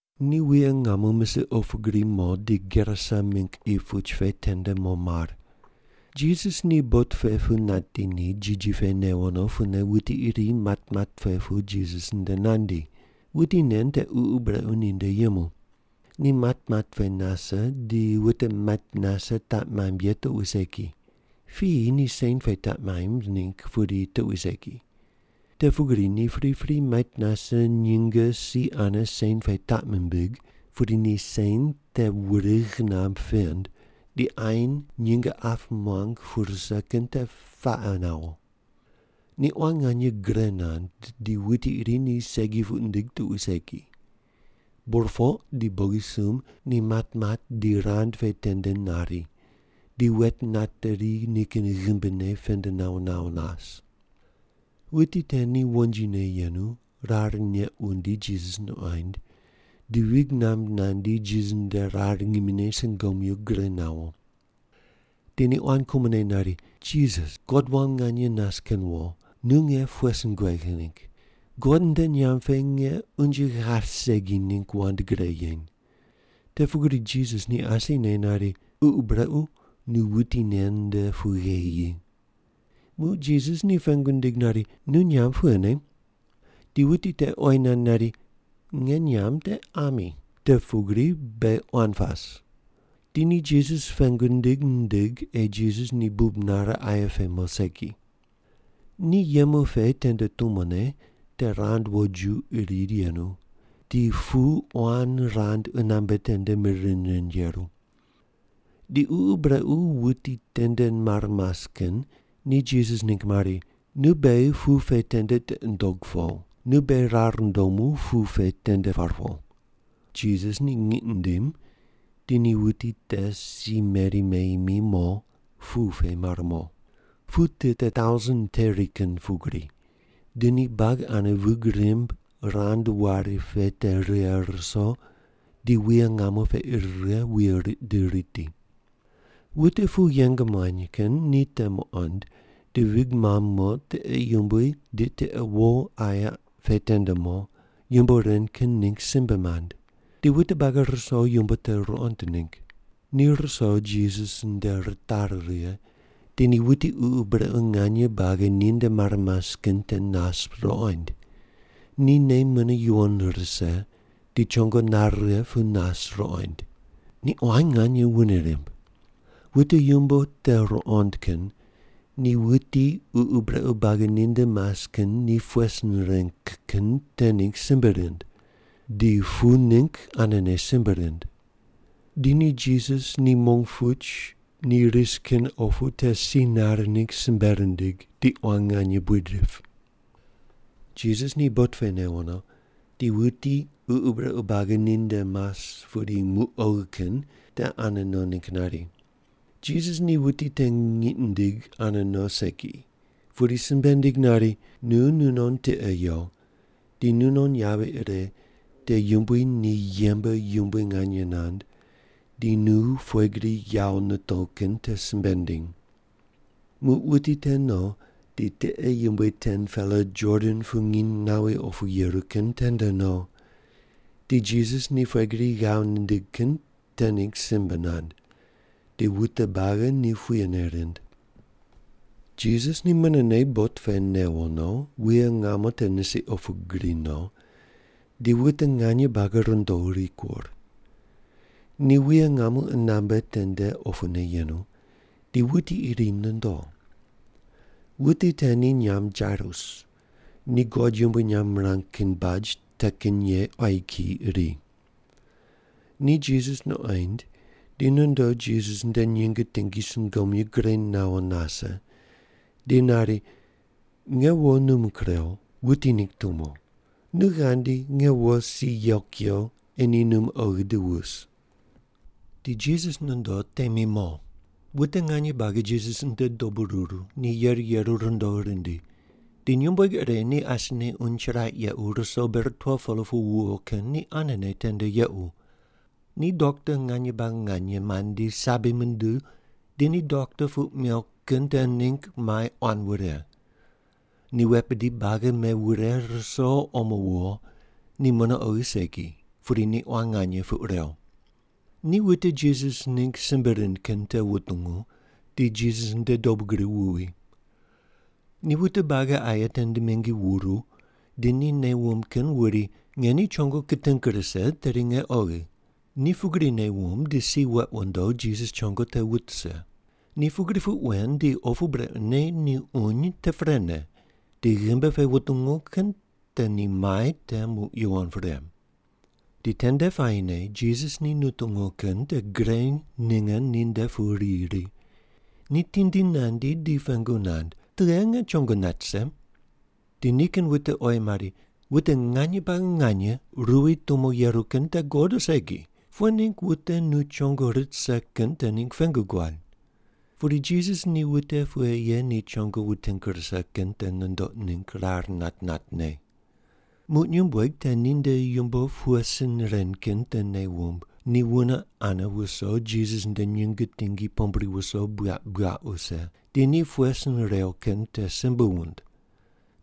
Ni wuye ngamo misiq opu gri mo di Gerasa mingg qi puch pe tende mo mar. Jisas ni bot pe pu nati ni, jiji pe newo no pune wuti iri matmat pe pu Jisas nde nandi. Wuti nen te ququ brequ ninde yemu. Ni matmat pe nase, di wute mait nase taq maimb ye tuqui segi. Piyi ni sen pe taq maimb ningg pudi tuqui segi. Te pugri ni pripri mait nase nyinge si ane sen pe taq mimbig, pudi ni sen te wurigh namb pend, di ain nyinge ap muang pu rise kin te paqe nawo. Ni quan nganye gre nand di wuti iri ni segi puq nindig tuqui segi. Burpoq di bogisumb ni matmat di rand pe tende nari, di wet nateri nikin ghimbine pend nawo nawo nas. Wuti te ni wonjine yenu, rar neq wundi Jisas nuqoind, di vig namb nandi Jisas nde rar ngimine sungomyu gure nawo. Di ni quan kumone nari, “Jisas, God wam nganye nas kin wo, nu nge pughe sin kuegh ningg? God nde nyamb pe nge unje ghaip segi ningg wand gre yeny.” Te pugri Jisas ni asine nari, “Ququ brequ, nu wuti nen nde pu gheyi yi.” Muq Jisas ni pengu nindig nari, “Nu nyamb pughene?” Di wuti te oyi nand nari, “Nge nyamb te Ami, te pugri beghi quan pas.” Di ni Jisas pengu nindig nindig ei Jisas ni bub nare aye pe mo segi. Ni yemu pe tende tumone te rand woju iri yenu, di pu quan rand qunambe tende mir rind rind yeru. Di ququ brequ wuti tende mar mas kin ni Jisas ningg mari, “Nu beghi pu pe tende tiqi ndog po, nu beghi rar ndomu pu pe tende par po.” Jisas ni ngiq nindim di ni wuti te si meri meyi mi mo, pu pe mar mo. Pu tit te tausen teri kin pugri, di ni buagi ane vig rimb rand wari pe te righe ruso, di wuye ngamo pe ir righe, wuye riq di riti. Wute pu yeng muany kin ni te muqond, di vig mamb mo tiqe yumbui di tiqe wo aye pe tende mo, yumbo ren kin ningg simbe mand. Di wute buagi ruso yumbo te ruqond ningg. Ni ruso Jisas nde ritari righe, di ni wuti ququ brequ nganye buagi ninde mar mas kin te nas ruqoind. Ni nei mune yuwon rise di chongo nare righe pu nas ruqoind. Ni quan nganye wune rimb. Wute yumbo te ruqond kin ni wuti ququ brequ buagi ninde mas kin ni pughe sin reng kin te ningg simbe rind. Di pu ningg anene simbe rind. Di ni Jisas ni mong puch ni ris kin opu te si nare ningg simbe rindig di quan nganye buid rip. Jisas ni bot pe newo no, di wuti ququ brequ buagi ninde mas pudi muq oghi kin te ane no ningg nari. Jisas ni wuti te ngiq nindig ane no segi, pudi simbe nindig nari, “Nu nunon tiqe yo, di nunon yavi ire te Yumbui ni yembe yumbui nganye nand di nu pughe gri yawo nitow kin te simbe ndiny.” Muq wuti te no di tiqe yumbui 10-pela Jordan pu nginy nawi opu yeru kin tende no, di Jisas ni pughe gri ghav nindig kin te ningg simbe nand. Di wute buagi ni puyene rind. Jisas ni munene bot pe newo no, wuye ngamo te nisiq opu gri no, di wute nganye buagi rundo rikur. Ni wuye ngamo qunambe tende opune yenu, di wuti iri nondo. Wuti te ni nyamb Jairus ni God yumbui nyamb mirang kin baj te kin ye quayi kiyi iri. Ni Jisas nuqoind, di nondo Jisas nde nyinge tingi sungomyu gre nawo nase, di nari, “Nge wo num kurew, wuti ningg tumo. Nu ghandi, nge wo si yew kuyo ei ni num oghi di wus.” Di Jisas nondo temi mo. Wute nganye buagi Jisas nde dobu ruru, di yeru yeru rundo rindi. Di nyumbueg ire ni asine uny chiraq yequ ruso ber 12-pela pu wuwo kin ni anene tende yequ. Ni dokta nganye buagi nganye mandi sabi munduw di ni dokta puq mew kin te ningg mai quan wure. Ni wet bidi buagi mewure ruso omo wuwo, ni mune oghi segi pudi ni quan nganye puq rew. Ni wute Jisas ningg simbe rind kin te wutungu, di Jisas nde dobu gri wuwi. Ni wute buagi aye tende mingi wuru di ni nei wumb kin wuri, “Nge ni chongone kiting rise, tedi nge oghi.” Ni pugri nei wumb di si weq wundo Jisas chongo te wut rise. Ni pugri puq wen di opu brequne ni uny te prene, di ghimbi pe wutungu kin te ni mai te muq yuwon pre. Di tende puayine Jisas ni nutungu kin te gre ninge ninde pu riyi ri. Ni tindi nandi di pengu nand, “Tughe nge chongo nat rise?” Di nikin wute oyi mari, “Wute nganye buagi nganye ruwi tumo yeru kin te guqod o segi? Pughe ningg wute nu chongo rit rise kin te ningg pengu guad?” Pudi Jisas ni wute pughe ye ni chongo wuting rise kin te nundoq ningg rar nat natne. Muq nyumbueg te ninde yumbo pughe sin ren kin te nei wumb, di wune ane wuso Jisas nde nyinge tingi pombri wuso buyaq buyaq wuse, di ni pughe sin rew kin te simbe wund.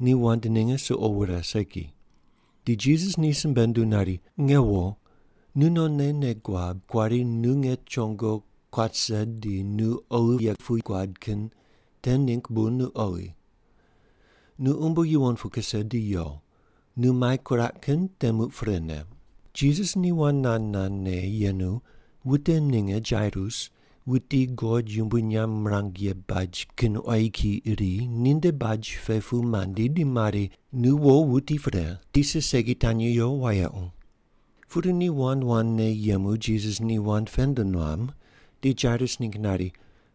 Ni wand ninge suqo wure segi. Di Jisas ni simbe nunduw nari, “Nge wo, nu nonne nei guab kuari nu nge chongo kuat rise di nu oghi ye puq guad kin te ningg bu nu oghi. Nu umbo yuwon pu kuse di yo, nu mai kuraq kin te muq prene.” Jisas ni wand nand nandne yenu wute ninge Jairus, wuti God yumbui nyamb mirang ye baj kin quayi kiyi iri, ninde baj pe pu mandi di mari, “Nu wo wuti pre. Tisa segi tanyi yo wayequ.” Pudi ni wand wandne yemu Jisas ni wand pend nuam di Jairus ningg nari,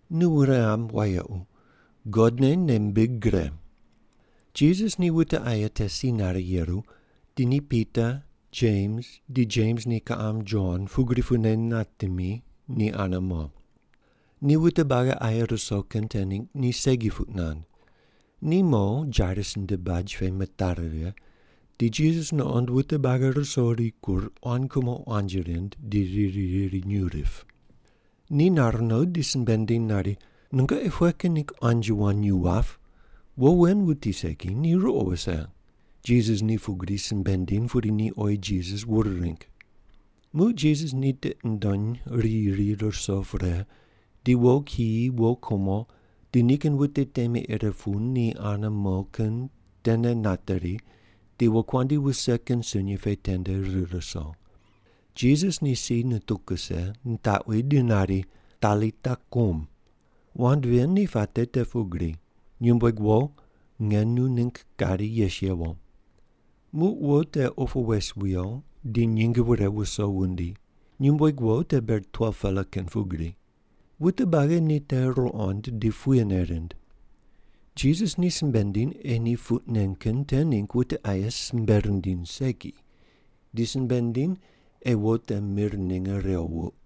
“Nu wune ghamb wayequ. God ne nei mbig gre.” Jisas ni wute aye te si nare yeru, di ni Pita, Jems di Jems ni kiqam Jon pugri pune natemi, ni ane mo. Ni wute buagi aye ruso kin te ningg ni segi puq nand. Ni mo Jairus nde baj pe mitari righe, di Jisas nuqond wute buagi ruso rikur quan kumo quanji rind di riri riri nyuw rip. Ni nar no di simbe nindiny nari, “Nungoqi pughe kin ningg quanji wand nyuw wap? Wo wen wuti segi, ni ruqo wuse.” Jisas ni pugri simbe nindiny, pudi ni oyi Jisas wur ring. Muq Jisas ni tiqi nundony riyi ri ruso pre, di wo kiyi, wo kumo di nikin wute temi ire pu ni ane mo kin tene nateri di wokuandi wuse kin sunyi pe tende rir ruso. Jisas ni si nituw kuse, nitaqwi di nari, “Talita kum.” (Wand ven ni puate te pugri, “Nyumbueg wo! Nge nu ningg kari yes yewo.”) Muq wo te opu wes wiyo di nyinge wure wuso wundi. Nyumbueg wo te ber 12-pela kin pugri. Wute buagi ni te ruqond di puyene rind. Jisas ni simbe nindiny ei ni puq nen kin te ningg wute aye simbe rindiny segi, di simbe nindiny ei wo te mir ninge rew wuq.